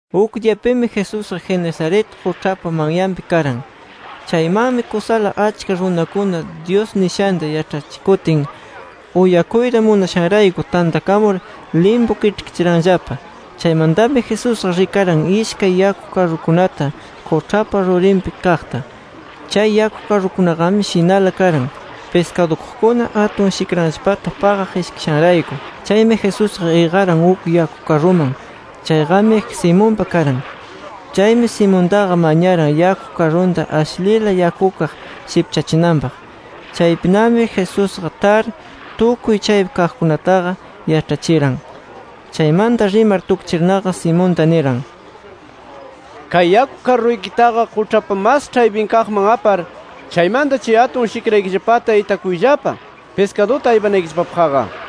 Uk diyapimi, Jesusqa Genesaret quĉhapa manyanpi karan. Chaymanmi kusala achka runakuna, Dyus nishanta yaĉhachikutin uyakuyta munashanrayku tantakamur limpu kiĉhkichiranllapa. Chaymantami Jesusqa rikaran ishkay yaku karrukunata quĉhapa rurinpi kaqta. Chay yaku karrukunaqami shinala karan, piskadukuqkuna atun shikranllapata paqaq ishkishanrayku. Chaymi Jesusqa iqaran uk yaku karruman. Chayqami Simonpa karan. Chaymi Simontaqa mañaran, yaku karrunta ashlila yakukaq sikpachinanpaq. Chaypinami Jesusqa tar, tukuy chaypi kaqkunataqa yaĉhachiran. Chaymanta rimar tukchirnaqa Simonta niran: —Kay yaku karruykitaqa quĉhapa mas ĉhaypinkaqman apar, chaymanta chay atun shikraykillapata itakuyllapa piskaduta aypanaykillapapaqqa, nir.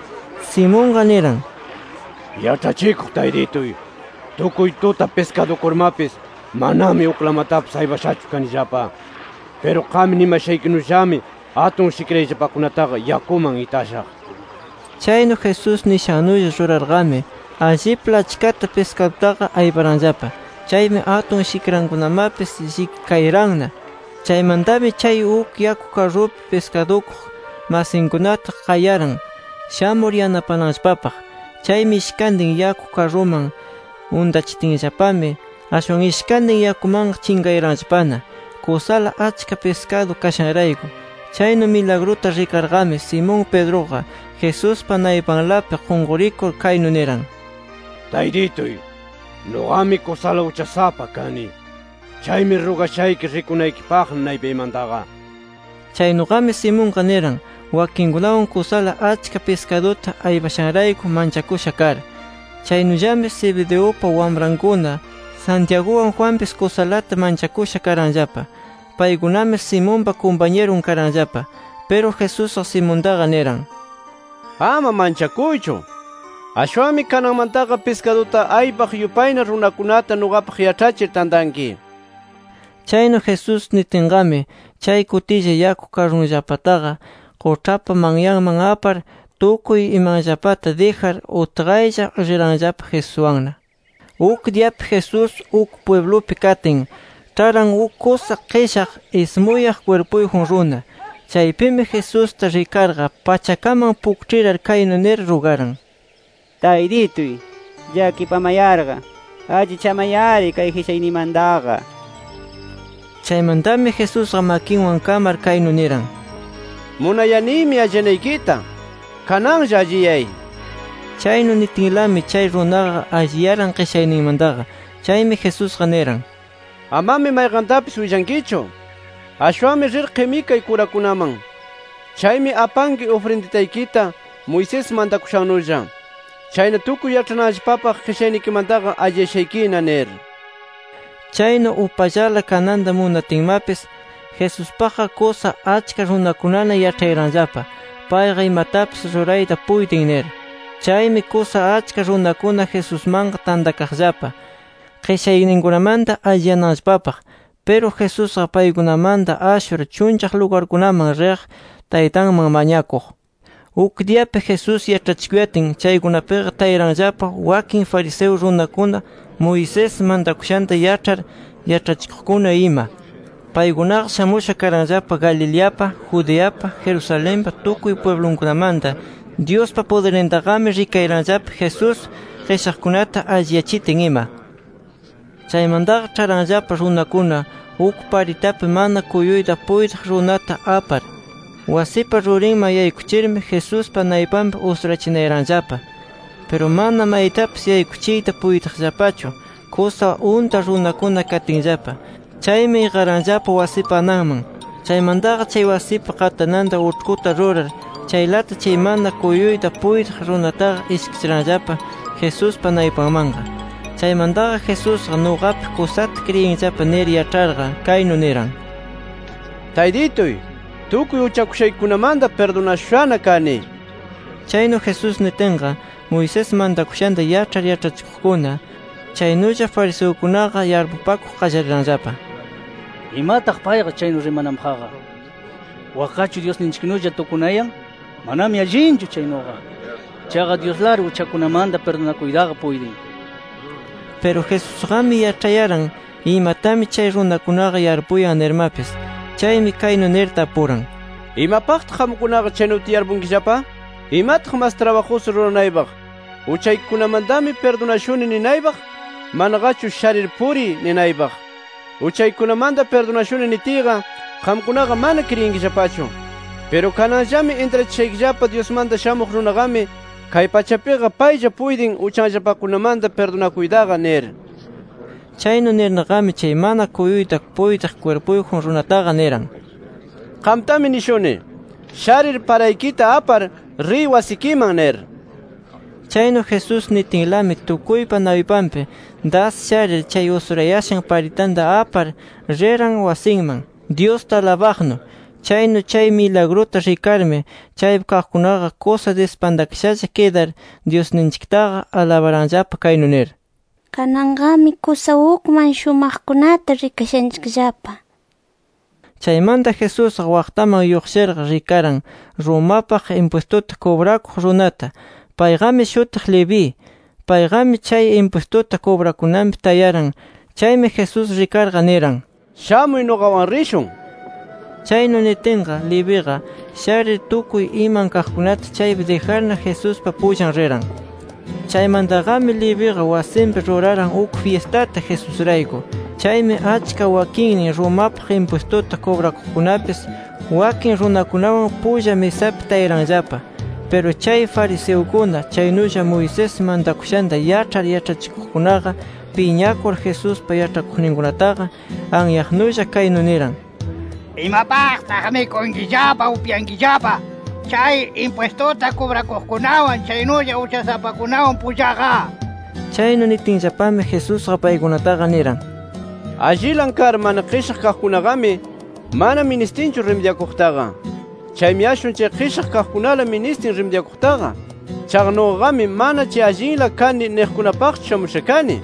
Simonqa niran: —Yaĉhachikuq Taytituy, tukuy tuta piskadukurmapis, manami uklamatapis aypashachu kanillapa. Piru qam nimashaykinullami atun shikrayllapakunataqa yakuman itashaq. Chaynu Jesús nishannulla rurarqami, allipla achkata piskadutaqa ayparanllapa. Chaymi atun shikrankunamapis llikikayaranna. Chaymantami chay uk yaku karrupi piskadukuq masinkunata qayaran shamur yanapananllapapaq. Chaymi ishkantin yaku karruman untachitinllapami, ashwan ishkantin yakumanqa chinqayaranllapana kusala achka piskadu kashanrayku. Chaynu milagruta rikarqami Simón Pedruqa, Jesuspa naypanlapi qunqurikur, kaynu niran: —Taytituy, ¡nuqami kusala uchasapa kani! ¡Chaymi rugashayki rikunaykipaqna naypaymantaqa! nir. Chaynuqami Simonqa niran, wakinninkunawan kusala achka piskaduta aypashanrayku manchakusha kar. Chaynullami Zebedeupa wamrankuna Santiaguwan Juanpis kusalata manchakusha karanllapa. Paykunami Simonpa kumpañirun karanllapa. Piru Jesusqa Simontaqa niran: —Ama manchakuychu. Ashwanmi kananmantaqa piskaduta aypaq yupayna runakunata nuqapaq yaĉhachir tantanki nir. Chaynu Jesús nitinqami, chay kutilla yaku karrunllapataqa quĉhapa manyanman apar, tukuy imanllapata dijar, utqaylla riranllapa Jesuswanna. Uk diyapi Jesús uk pwiblupi katin, ĉharan uk kusa qishaq ismuyaq kwirpuyjun runa. Chaypimi Jesusta rikarqa, pachakaman pukĉhirar kaynu nir rugaran: —¡Taytituy! llakipamayarqa allichamay-ari kay qishayniymantaqa nir. Chaymantami Jesusqa makinwan kamar, kaynu niran: —Munayanimi alliyanaykita. ¡Kananlla alliyay! nir. Chaynu nitinlami, chay runaqa alliyaran qishayninmantaqa. Chaymi Jesusqa niran: —Amami mayqantapis willankichu. Ashwanmi rir qimikay kurakunaman. Chaymi apanki ufrinditaykita Moisés mantakushannulla. Chayna tukuy yaĉhananllapapaq qishaynikimantaqa alliyashaykina nir. Chaynu upallala kananta munatinmapis, Jesuspaqqa kusa achka runakunana yaĉhayaranllapa, payqa imatapis rurayta puytin nir. Chaymi kusa achka runakuna Jesusmanqa tantakaqllapa, qishayninkunamanta alliyananllapapaq. Piru Jesusqa paykunamanta ashur chunllaq lugarkunaman riq Taytanman mañakuq. Uk diyapi Jesús yaĉhachikuyatin, chaykunapiqa tayaranllapa wakin fariseo runakuna, Moisés mantakushanta yaĉhar yaĉhachikuqkuna ima. Paykunaqa shamusha karanllapa, Galileapa, Judeapa, Jerusalenpa tukuy pwiblunkunamanta. Dyuspa pudirnintaqami rikayaranllapa, Jesús qishaqkunata alliyachitin ima. Chaymantaqa ĉharanllapa runakuna uk paritapi mana kuyuyta puytiq runata apar. Wasipa rurinman yaykuchirmi, Jesuspa naypanpi usurachinayaranllapa. Piru mana maytapis yaykuchiyta puytiqllapachu, kusa unta runakuna katinllapa. Chaymi iqaranllapa wasipa ananman. Chaymantaqa chay wasipa qatananta uĉhkuta rurar, chaylata chay mana kuyuyta puytiq runataqa ishkichiranllapa Jesuspa naypanmanqa. Chaymantaqa Jesusqa nuqapi kusata kriyinllapa nir yaĉharqa, kaynu niran: —Taytituy, tukuy uchakushaykikunamanta pirdunashushana kani nir. Chaynu Jesús nitinqa, Moisés mantakushanta yaĉhar yaĉhachikuqkuna, chaynulla fariseukunaqa yarpupakuq qallariranllapa: ¿Imataq payqa chaynu rimananpaqqa? Wakqachu Dyusninchiknulla tukunayan. Manami allinchu chaynuqa. Chaqa Dyuslari uchakunamanta pirdunakuytaqa puytin nir. Piru Jesusqami yaĉhayaran, imatami chay runakunaqa yarpuyan nirmapis. Chaymi kaynu nir tapuran: —¿Imapaqtaq qamkunaqa chaynuta yarpunkillapa? ¿Imataq mas trabajusu ruranaypaq, ‘Uchaykikunamantami pirdunashuni’ ninaypaq, manaqachu ‘Sharir puriy’, ninaypaq? ‘Uchaykikunamanta pirdunashuni’ nitiyqa, qamkunaqa mana kriyinkillapachu. Piru kananllami intrachishaykillapa Dyusmanta Shamuq Runaqami kay pachapiqa paylla puytin uchanllapakunamanta pirdunakuytaqa nir. Chaynu nirnaqami chay mana kuyuyta puytiq kwirpuyjun runataqa niran: —Qamtami nishuni: Sharir paraykita apar, riy wasikiman nir. Chaynu Jesús nitinlami tukuypa naypanpi das sharir, chay usurayashan paritanta apar riran wasinman, Dyusta alabaqnu. Chaynu chay milagruta rikarmi chaypi kaqkunaqa kusa dispantakashalla kidar, Dyusninchiktaqa alabaranllapa kaynu nir: “Kananqami kusa ukman shumaqkunata rikashanchikllapa” nir. Chaymanta Jesusqa waqtaman lluqshirqa, rikaran Romapaq impwistuta kubrakuq runata. Payqami shutiq Leví. Payqami chay impwistuta kubrakunanpi tayaran. Chaymi Jesús rikarqa niran: —Shamuy nuqawan rishun nir. Chaynu nitinqa Leviqa sharir, tukuy iman kaqkunata chaypi dijarna, Jesuspa pullan riran. Chaymantaqami Leviqa wasinpi ruraran uk fyistata, Jesusrayku. Chaymi achka wakinnin Romapaq impwistuta kubrakuqkunapis wakin runakunawan pulla misapi tayaranllapana. Piru chay fariseukuna, chaynulla Moisés mantakushanta yaĉhar yaĉhachikuqkunaqa piñakur, Jesuspa yaĉhakuqninkunataqa anyaqnulla, kaynu niran: —¿Imapaqtaq mikunkillapa, upyankillapa, chay impwistuta kubrakuqkunawan chaynulla uchasapakunawan pullaqa? nir. Chaynu nitinllapami, Jesusqa paykunataqa niran: —Allilan kar mana qishaq kaqkunaqami mana ministinchu rimidyakuqtaqa. Chaymi ashwan chay qishaq kaqkunala ministin rimidyakuqtaqa. Chaqa nuqaqami mana, chay allinla kani niqkunapaqchu shamusha kani.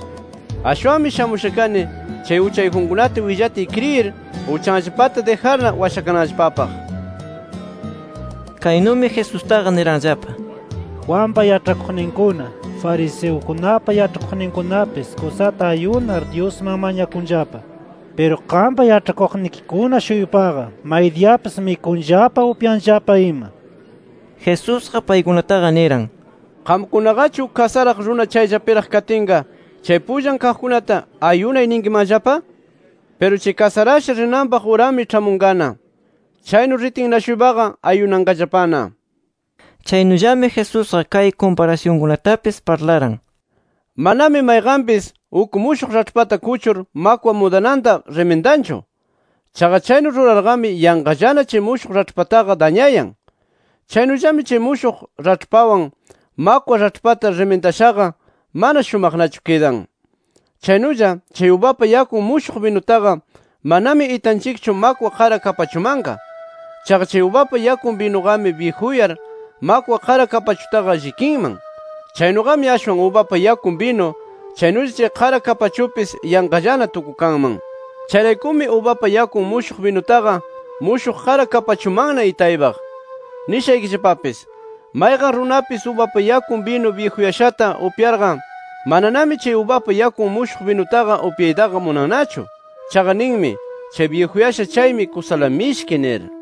Ashwanmi shamusha kani, chay uchayjunkunata willatiy kriyir, uchanllapata dijarna washakananllapapaq. Kaynumi Jesustaqa niranllapa: —Juanpa yaĉhakuqninkuna, fariseukunapa yaĉhakuqninkunapis kusata ayunar, Dyusman mañakunllapa. Piru qampa yaĉhakuqnikikuna-shuypaqa maydiyapis mikunllapa, upyanllapa ima. Jesusqa paykunataqa niran: —Qamkunaqachu uk kasaraq runa chayllapiraq katinqa chay pullan kaqkunata, ¿‘Ayunay’ ninkimanllapa? Piru chay kasarasha rinanpaq urami ĉhamunqana. Chaynu ritinna-shuypaqa ayunanqallapana. Chaynullami Jesusqa kay kumparasyunkunatapis parlaran: “Manami mayqanpis uk mushuq raĉhpata kuchur, makwa mudananta rimindanchu. Chaqa chaynu rurarqami yanqallana chay mushuq raĉhpataqa dañayan. Chaynullami chay mushuq raĉhpawan, makwa raĉhpata rimindashaqa mana shumaqnachu kidan. Chaynulla, chay ubapa yakun mushuq binutaqa manami itanchikchu makwa qara kapachumanqa. Chaqa chay ubapa yakun binuqami byijuyar makwa qara kapachutaqa llikinman. Chaynuqami ashwan ubapa yakun binu chaynulla chay qara kapachupis yanqallana tukukanman. Chayraykumi, ubapa yakun mushuq binutaqa mushuq qara kapachumanna itaypaq. Nishaykillapapis: Mayqan runapis ubapa yakun binu byijuyashata upyayarqa, mananami chay ubapa yakun mushuq binutaqa upyaytaqa munannachu. Chaqa ninmi: Chay byijuyasha chaymi, kusala mishki nir”.